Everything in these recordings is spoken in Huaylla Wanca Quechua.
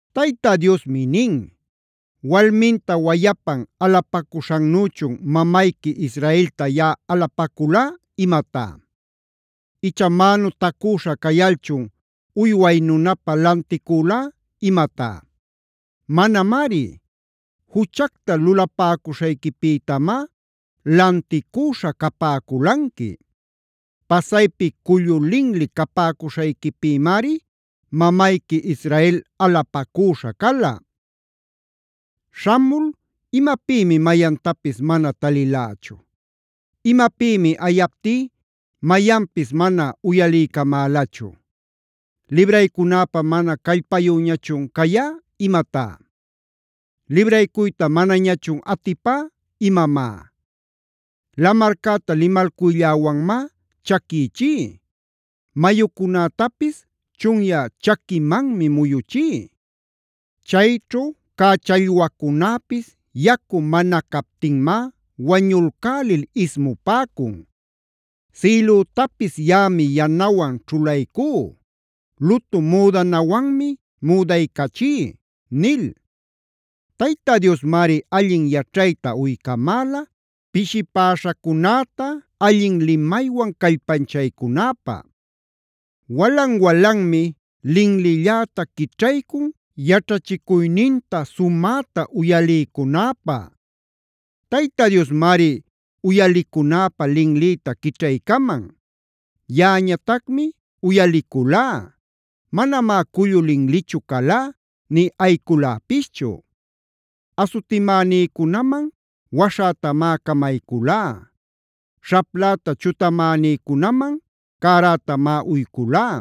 Tayta Diosmi nin: “¿Walminta wayapan alapacüśhannüchun mamayqui Israelta yaꞌa alapacülá imatá? ¿Icha mänutacüśha cayalchun uyway nunapä lanticülá imatá? Manamari. Juchacta lulapäcuśhayquipïtamá lanticüśha capäculanqui; pasaypi cullu linli capäcuśhayquipïmari mamayqui Israel alapacüśha cala. Śhamul ¿imapïmi mayantapis mana talilächu? ¿Imapïmi ayaptí mayanpis mana uyaliycamälachu? ¿Libraycunäpä mana callpayüñachun cayä imatá? ¿Libraycuyta manañachun atipä imamá? Lamarcäta limalcuylläwanmá chaquichí; mayucunätapis chunyä chaquimanmi muyuchí. Chayćhu cä challwacunäpis yacu mana captinmá wañulcälil ismupäcun. Sïlütapis yaꞌami yanawan ćhulaycú; lutu müdanawanmi müdaycachí” nil. Tayta Diosmari allin yaćhayta uycamäla, pishipäśhacunäta allin limaywan callpanchaycunäpä. Walan-walanmi linlilläta quićhaycun yaćhachicuyninta sumäta uyaliycunäpä. Tayta Diosmari uyalicunäpä linlïta quićhaycaman. Yaꞌañatacmi uyaliculá; manamá cullu linlichu calá nï ayïculäpischu. Asutimänïcunaman waśhätamá camayculá; śhapläta chutamänïcunaman cärätamá uyculá.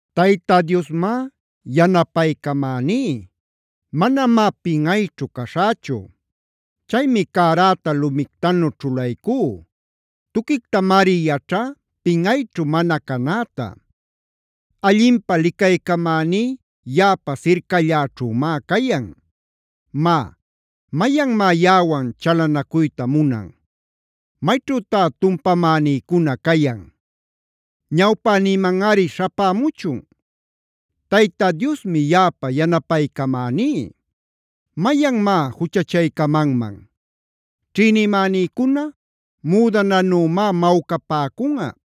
Tayta Diosmá yanapaycamäní; manamá pinꞌayćhu caśhächu. Chaymi cäräta lumictanu ćhulaycú; tuquictamari yaćhá pinꞌayćhu mana canäta. Allinpä licaycamäní yaꞌapa sircalläćhümá cayan. Má, ¿mayanmá yaꞌawan chalanacuyta munan? ¿Mayćhütá tumpamänïcuna cayan? Ñawpänïmanꞌari śhapämuchun. Tayta Diosmi yaꞌapa yanapaycamaní. ¿Mayanmá juchachaycamanman? Ćhïnimänïcuna müdananümá mawcapäcunꞌa;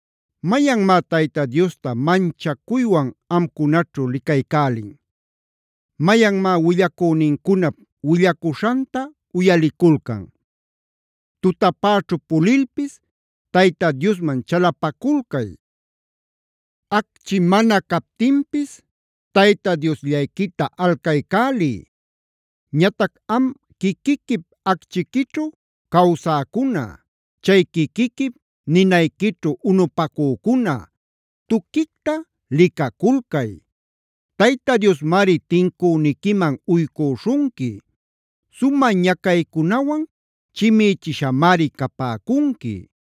¿Mayanmá Tayta Diosta manchacuywan amcunaćhu licaycälin? ¿Mayanmá willacünincunap willacuśhanta uyaliculcan? Tutapäćhu pulilpis Tayta Diosman chalapaculcay; acchi mana captinpis Tayta Diosllayquita alcaycäliy. Ñatac am quiquiquip acchiquićhu cawsäcuna, chay quiquiquip ninayquićhu unupacücuna, tuquicta licaculcay. Tayta Diosmari tincüniquiman uycüśhunqui; sumä ñacaycunawan chimïchishamari capäcunqui.